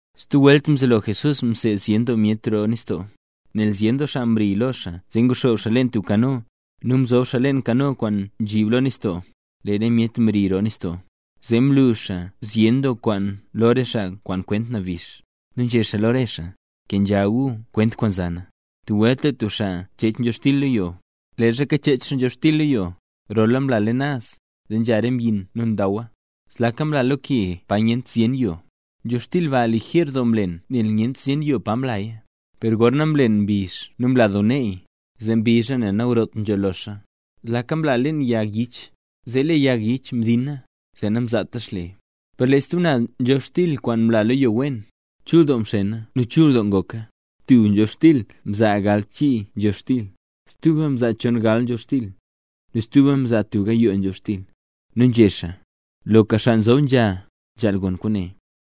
Stub welt mzelo Jesús mseed zyen doo myet roo nistoo. Nel zyen doo xaa mri lo xaa zee nguxoob xaa leen tub kano, nu mzob xaa leen kano kwaan nzhib lo nistoo. Lee re myet mri roo nistoo. Zee mlu xaa zyen doo kwaan lo re xaa kwaan kwent nabix. Nu nzhé xaa lo re xaa: —Kenzha gu kwent kwaan za na. Tub welt lee tub xaa nchech nzhobxtil lo yo. Leezha kachech xaa nzhobxtil lo yo, rola mla leen naz, zee nzha re mbyin nu ndawa. Zlaka mla lo ke pa nyent zyen yo. Nzhobxtil ba lijer doo mlen nel nyent zyen yoo pa mlaya. Per gorna mlen mbizh nu mla doo neey, zee mbizha nel nagrot nzho loxa. Zlaka mla leen yag yich, zee lee yag yich mdina, zee namzaata xle. Per lee stub naz nzhobxtil kwaan mla lo yo wen, chul doo mxena nu chul doo ngoka. Tub nzhobxtil mzaa galbchii nzhobxtil, stuba mzaa chongal nzhobxtil, nu stuba mzaa tub gayoo nzhobxtil. Nu nzhé xaa: —¡Loka xaa nzob nzha, nzhaal gon kwaane!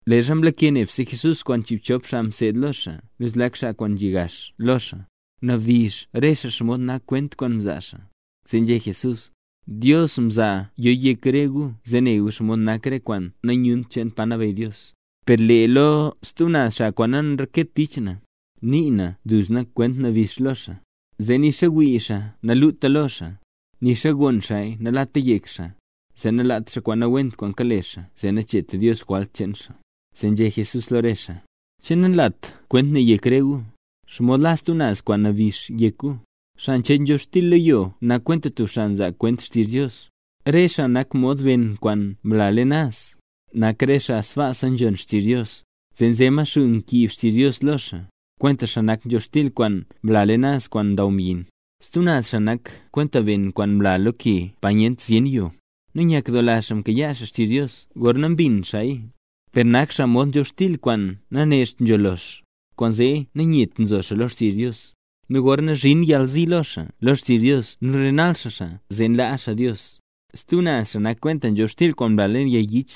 Leezha mlake nebse Jesús kwaan chiibchop xaa mseed lo xaa nu zlak xaa kwaan nzhi gax lo xaa, mnabdizh re xaa xomod nak kwent kwaan mzaa xaa. Zee nzhé Jesús: —Dios mzaa yo yek re gu zee ne gu xomod nak re kwaan nanyunt cheen pa nabeyy Dios; per lee lo stub naz xaa kwaan nanreket tich na, nii na duzna kwent nabix lo xaa. Zee nixa wii xaa naluta lo xaa, nixa gon xaaya nalata yek xaa, zee nalaat xaa kwaan nawent kwaan kale xaa zee nacheet Dios jwalt cheen xaa. Zee nzhé Jesús lo re xaa: —¿Che nanlat kwent ne yek re gu? ¿Xomod la stub naz kwent nabix yek gu? Xaa nchech nzhobxtil lo yo nak kwenta tub xaa nzaa kwent xtizh Dios. Re xaa nak mod ben kwaan mla leen naz, nak re xaa sbaasa nzhon xtizh Dios, zee nze Maxuu nkiib xtizh Dios lo xaa, kwentaxa nak nzhobxtil kwaan mla leen naz kwaan ndaw mbyin. Stub naz xaa nak kwenta ben kwaan mla lo ke pa nyent zyen yo; nu nyakdoola xaa mkayaa xaa xtizh Dios gorna mbin xaaya. Per nak xaa mod nzhobxtil kwaan nanecht nzho lox, kwaanzee nanyet nzo xaa lo xtizh Dios. Nu gorna nzhin yalzi lo xaa lo xtizh Dios nu nrenal xaa xaa, zee nlaa xaa Dios. Stub naz xaa nak kwenta nzhobxtil kwaan mla leen yag yich;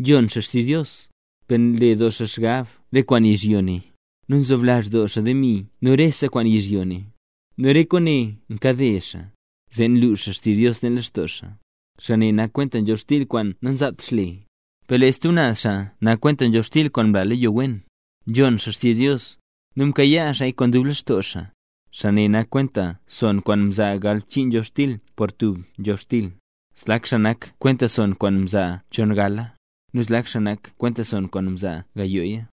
nzhon xaa xtizh Dios, per nle doo xaa xgab re kwaan yizhyo ne, nu nzoblazh doo xaa demi nu rese kwaan yizhyo ne, nu re kwaane nkade xaa, zee nluux xtizh Dios leen lextoo xaa. Xaa ne nak kwenta nzhobxtil kwaan namzaat xle. Per stub naz xaa nak kwenta nzhobxtil kwaan mla lo yo wen. Nzhon xaa xtizh Dios, nu nkayaa xaaya kwaan dub lextoo xaa. Xaa ne nak kwenta son kwaan mzaa galbchii nzhobxtil por tub nzhobxtil, zlak xaa nak kwenta son kwaan mzaa chongala, nu zlak xaa nak kwenta son kwaan mzaa gayooya.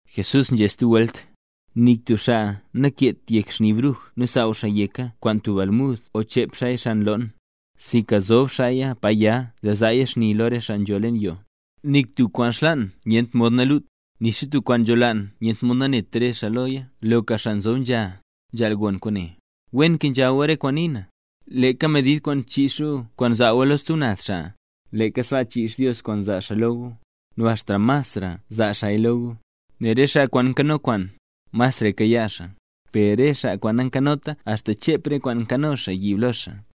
Jesús nzhé stub welt: —Nik tub xaa nankeet xni bruj nu nsaaw xaa yeka kwaan tub almud o chep xaaya xan loon, sinka nzob xaaya pa ya zee zaaya xni lo re xaa nzho leen yoo. Nik tub kwaan xlaan nyent mod nalut, nixa tub kwaan nzholaan nyent mod nanet re xaa loya. ¡Loka xaa nzob nzha, nzhaal gon kwaane! Wen kenzha gu re kwaan nii na. Leeka medid kwaan nchiix gu kwaan nzaa gu lo stub naz xaa, leeka sbaa chiix Dios kwaan zaa xaa lo gu, nu axta masra zaa xaaya lo gu. Nel re xaa kwaan nkano kwaan, masraya kayaa xaa; per lee re xaa nankanota axta chep re kwaan nkano xaa yiib lo xaa.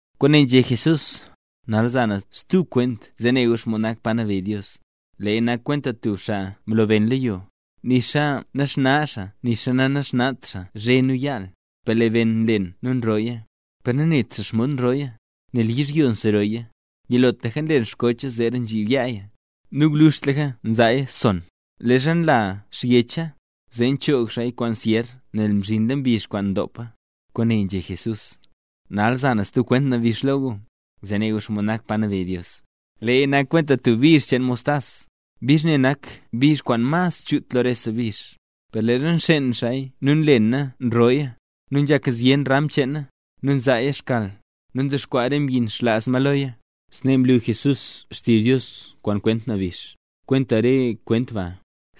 Kwaane nzhé Jesús: —Nal za na stub kwent zee ne gu nen xomod nak pa nabeyy Dios. Leeya nak kwenta tub xaa mlo ben lo yo. Nixa naxna nixa nanaxnat xaa zhe nu yaal, per lee ben nlen nu nrooya, per nanet xaa xomod nrooya, nel yizhyo nserooya. Yilotlaka nlen xkocha, zeera nzhib yaaya, nu gwluzhtlaka nzaaya son. Leezha nla xyecha, zee nchoog xaaya kwaan syer nel mzhinla mbizh kwaan ndopa. Kwaane nzhé Jesús: —Nal za na stub kwent nabix lo gu, zee ne gu xomod nak pa nabeyy Dios. Leeya nak kwenta tub bizh cheen mostas. Bizh ne nak bizh kwaan mas chut lo rese bizh. Per leezha nxeen xaaya nu nlena nrooya, nu nzhak zyen ram cheena, nu nzaaya xkal. Nu ndexkwaa re mbyin xlaaz ma loya. Snee mlu Jesús xtizh Dios kwaan kwent nabix, kwenta re kwent ba.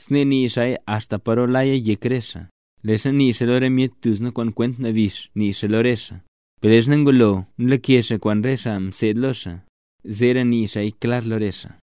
Snee nii xaaya axta paro laya yek re xaa. Leezha nii xaa lo re myet duzna kwaan kwent nabix nii xaa lo re xaa, per leezha ngulo nlake xaa kwaan re xaa mseed lo xaa, zeera nii xaaya klar lo re xaa.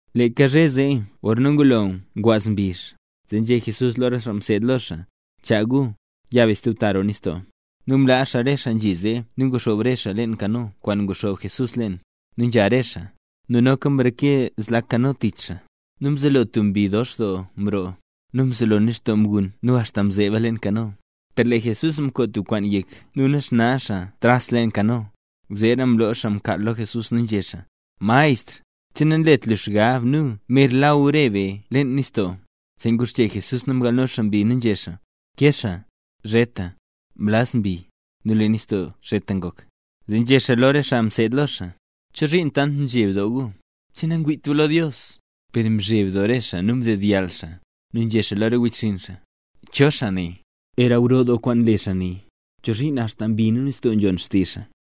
Leeka zhe zee gorna ngulo ngwaaz mbizh, zee nzhé Jesús lo re xaa mseed lo xaa: —Chaa gu, ya be stub ta roo nistoo. Nu mlaa xaa rese xaa nzhi zee nu nguxoob re xaa leen kano kwaan nguxoob Jesús leen, nu nzha re xaa. Nu noka mreke zlak kano tich re xaa. Nu mzelo tub mbi dox doo mroo, nu mzelo nistoo mgun nu axta mzeeba leen kano. Per lee Jesús mkoo tub kwaan yek nu naxna xaa naz tras leen kano. Zeera mloo xaa mkaal lo Jesús nu nzhé xaa: —Maestr, ¿che nanlet lu xgab nu mer law re be leen nistoo? Zee nguxche Jesús nu mgalno xaa mbi nu nzhé xaa: —¡Kexa! ¡Zheta! Mlaz mbi, nu lee nistoo zheta ngok. Zee nzhé xaa lo re xaa mseed lo xaa: —¿Chozhiin tant nzheb doo gu? ¿Che nangwiit gu lo Dios? Per mzheb doo re xaa nu mdedyall xaa, nu nzhé xaa lo re wechxinn xaa: —¿Cho xaa ne? ¡Era gro doo kwaan nle xaa ne! ¿Chozhiin axta mbi nu nistoo nzhon xtizh xaa?